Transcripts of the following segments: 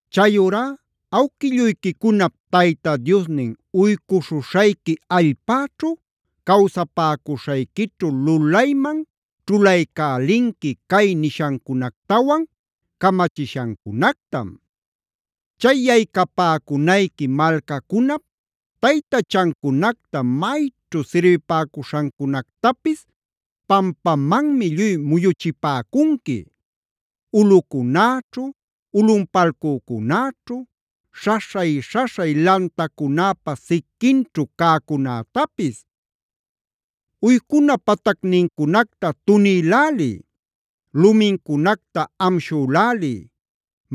“Chayurá awquilluyquicunap Tayta Diosnin uycuśhuśhayqui allpäćhu cawsapäcuśhayquićhu lulayman ćhulaycälinqui cay nishancunactawan camachishancunactam. “Chay yaycapäcunayqui malcacunap taytachancunacta mayćhu sirbipäcuśhancunactapis pampamanmi lluy muyuchipäcunqui: ulꞌucunäćhu, ulꞌunpalcücunäćhu, śhaśhay-śhaśhay lantacunäpa siquinćhu cäcunätapis. Uycuna patacnincunacta tunïläliy; lumincunacta amshüläliy;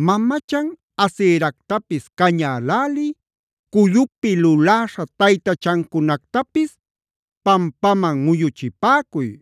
mamachan Aseractapis cañäläliy, cullupi luläśha taytachancunactapis pampaman muyuchipäcuy.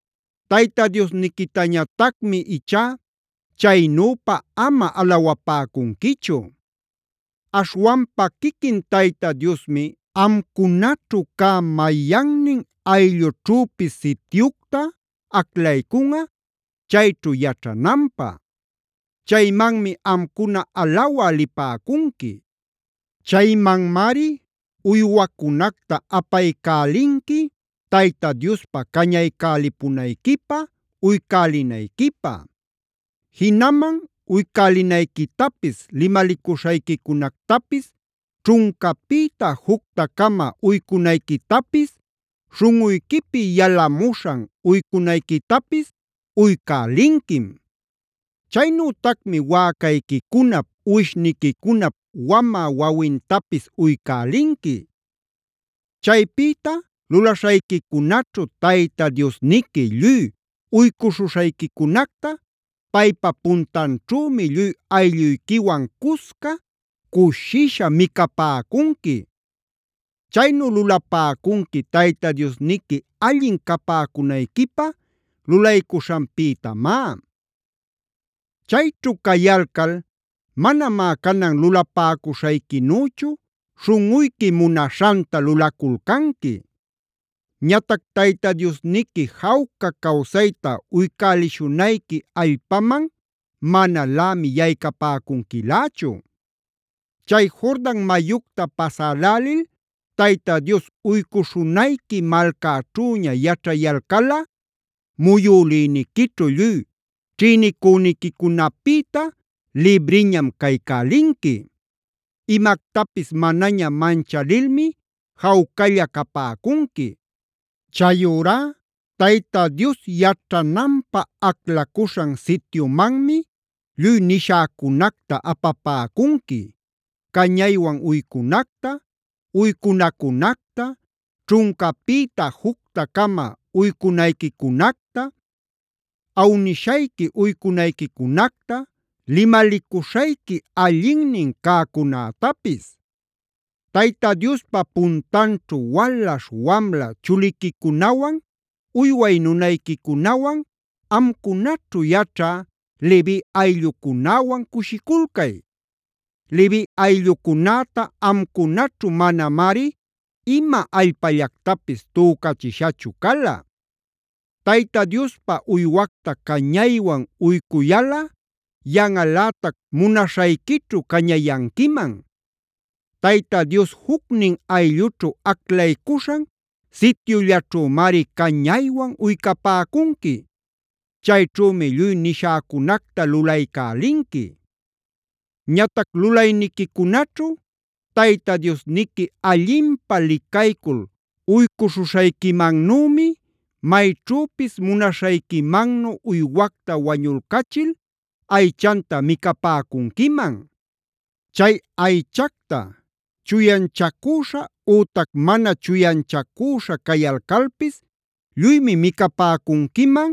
“Tayta Diosniquitañatacmi ichá chaynüpa ama alawapäcunquichu. Aśhwanpa quiquin Tayta Diosmi amcunaćhu cä mayannin ayllućhüpis sityucta aclaycunꞌa, chayćhu yaćhananpä. Chaymanmi amcuna alawä lipäcunqui. Chaymanmari uywacunacta apaycälinqui Tayta Diospa cañaycälipunayquipä, uycälinayquipä. Jinaman uycälinayquitapis, limalicuśhayquicunactapis ćhuncapïta jucta-cama uycunayquitapis, śhunꞌuyquipi yalamuśhan uycunayquitapis uycälinquim. Chaynütacmi wäcayquicunap, uwishniquicunap wamä wawintapis uycälinqui. Chaypïta lulaśhayquicunaćhu Tayta Diosniqui lluy uycuśhuśhayquicunacta paypa puntanćhümi lluy aylluyquiwan cusca cushisha micapäcunqui. Chaynu lulapäcunqui Tayta Diosniqui allin capäcunayquipä lulaycuśhanpïtamá. “Chayćhu cayalcal manamá canan lulapäcuśhayquinüchu śhunꞌuyqui munaśhanta lulaculcanqui.b Ñatac Tayta Diosniqui jawca cawsayta uycälishunayqui allpaman manalämi yaycapäcunquilächu. Chay Jordan mayucta pasälälil Tayta Dios uycuśhunayqui malcaćhüña yaćhayalcalꞌa muyülïniquićhu lluy ćhïnicüniquicunapïta libriñam caycälinqui; imactapis manaña manchalilmi jawcalla capäcunqui. Chayurá Tayta Dios yaćhananpä aclacuśhan sityumanmi lluy nishäcunacta apapäcunqui: cañaywan uycunacta, uycunacunacta, ćhuncapïta jucta-cama uycunayquicunacta, awnishayqui uycunayquicunacta, limalicuśhayqui allinnin cäcunätapis. Tayta Diospa puntanćhu walaśh wamla chuliquicunawan, uyway nunayquicunawan, amcunaćhu yaćhä Levi ayllucunäwan cushiculcay. Levi ayllucunäta amcunaćhu manamari ima allpallactapis tücachishachu cala. “Tayta Diospä uywacta cañaywan uycuyalꞌa yanꞌalätac munaśhayquićhu cañayanquiman. Tayta Dios jucnin ayllućhu aclaycuśhan sityullaćhümari cañaywan uycapäcunqui. Chayćhümi lluy nishäcunacta lulaycälinqui. “Ñatac lulayniquicunaćhu Tayta Diosniqui allinpä licaycul uycuśhuśhayquimannümi mayćhüpis munaśhayquimannu uywacta wañulcachil aychanta micapäcunquiman. Chay aychacta chuyanchacüśha ütac mana chuyanchacüśha cayalcalpis lluymi micapäcunquiman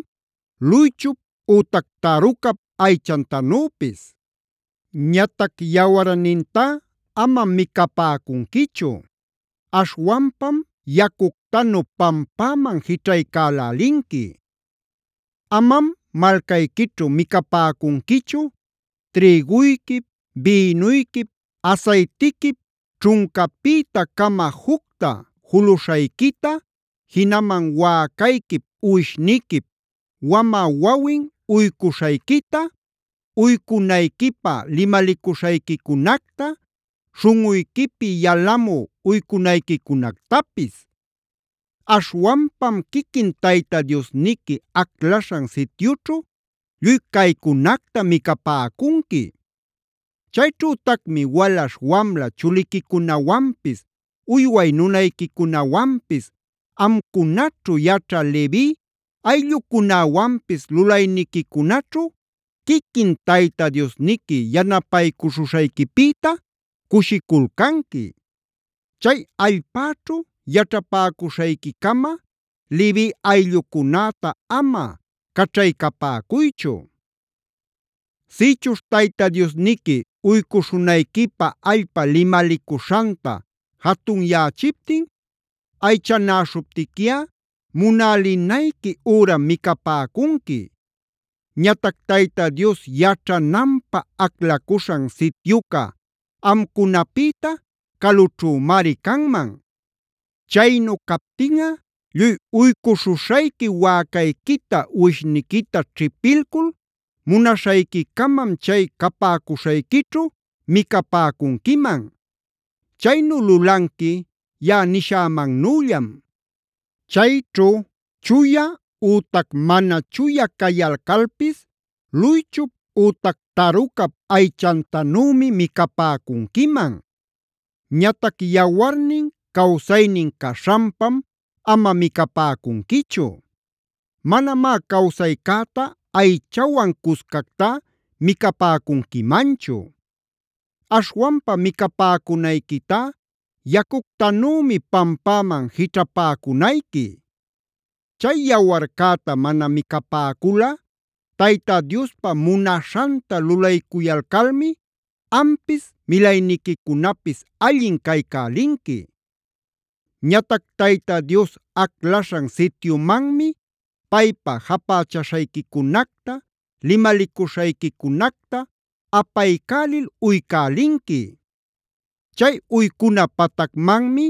luychup ütac tarucap aychantanüpis. Ñatac yawarnintá amam micapäcunquichu;c aśhwanpam yacuctanu pampäman jićhaycälälinqui. “Amam malcayquićhu micapäcunquichu: Trïguyquip, bïnuyquip, asaytiquip ćhuncapïta-cama jucta juluśhayquita, jinaman wäcayquip uwishniquip wamä wawin uycuśhayquita, uycunayquipä limalicuśhayquicunacta, śhunꞌuyquipi yalamü uycunayquicunactapis. Aśhwanpam quiquin Tayta Diosniqui aclaśhan sityućhu lluy caycunacta micapäcunqui. Chayćhütacmi walaśh wamla chuliquicunawanpis, uyway nunayquicunawanpis, amcunaćhu yaćha Levi ayllucunäwanpis lulayniquicunaćhu quiquin Tayta Diosniqui yanapaycuśhuśhayquipïta cushiculcanqui. Chay allpäćhu yaćhapäcuśhayquicama Levi ayllucunäta ama caćhaycapäcuychu. “Sïchuśh Tayta Diosniqui uycuśhunayquipä allpa limalicuśhanta jatunyächiptin, aychanäśhuptiquiꞌa munälinayqui üram micapäcunqui. Ñatac Tayta Dios yaćhananpä aclacuśhan sityuca amcunapïta calućhümari canman. Chaynu captinꞌa lluy uycuśhuśhayqui wäcayquita uwishniquita ćhipilcul munaśhayquicamam chay capäcuśhayquićhu micapäcunquiman. Chaynu lulanqui yaꞌa nishämannüllam. Chayćhu chuya ütac mana chuya cayalcalpis luychup ütac tarucap aychantanümi micapäcunquiman. Ñatac yawarnin cawsaynin caśhanpam ama micapäcunquichu. Manamá cawsaycäta aychawan cuscactá micapäcunquimanchu. Aśhwanpa micapäcunayquitá yacuctanümi pampäman jićhapäcunayqui.d Chay yawarcäta mana micapäculꞌa Tayta Diospa munaśhanta lulaycuyalcalmi ampis milayniquicunapis allin caycälinqui. “Ñatac Tayta Dios aclaśhan sityumanmi paypa japächaśhayquicunacta, limalicuśhayquicunacta apaycälil uycälinqui. Chay uycuna patacmanmi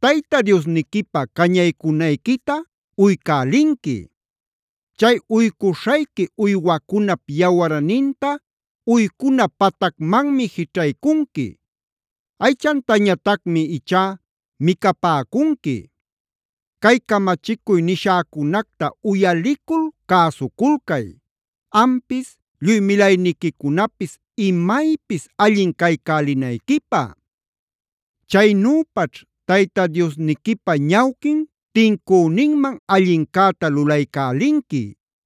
Tayta Diosniquipa cañaycunayquita uycälinqui. Chay uycuśhayqui uywacunap yawarninta uycuna patacmanmi jićhaycunqui; aychantañatacmi ichá micapäcunqui. “Cay camachicuy nishäcunacta uyalicul cäsuculcay, ampis lluy milayniquicunapis imaypis allin caycälinayquipä. Chaynüpaćh Tayta Diosniquipa ñawquin tincüninman allincäta lulaycälinqui.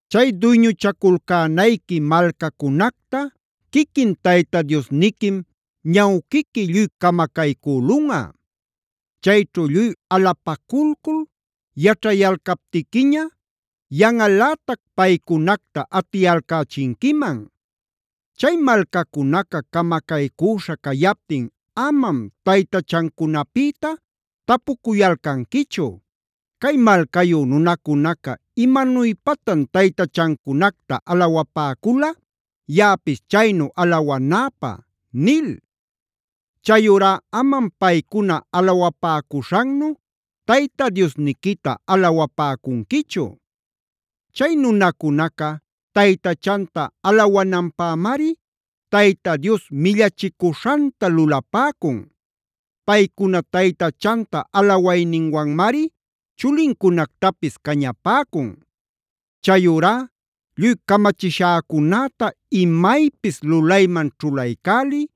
“Chay duyñuchaculcänayqui malcacunacta quiquin Tayta Diosniquim ñawquiqui lluy camacaycülunꞌa. Chayćhu lluy alapaculcul yaćhayalcaptiquiña, yanꞌalätac paycunacta atiyalcächinquiman. Chay malcacunaca camacaycüśha cayaptin amam taytachancunapïta tapucuyalcanquichu: ‘¿Cay malcayu nunacunaca imanuypatan taytachancunacta alawapäcula, yaꞌapis chaynu alawanäpä?’ nil. Chayurá amam paycuna alawapäcuśhannu Tayta Diosniquita alawapäcunquichu. Chay nunacunaca taytachanta alawananpämari Tayta Dios millachicuśhanta lulapäcun; paycuna taytachanta alawayninwanmari chulincunactapis cañapäcun. “Chayurá lluy camachishäcunäta imaypis lulayman ćhulaycäliy,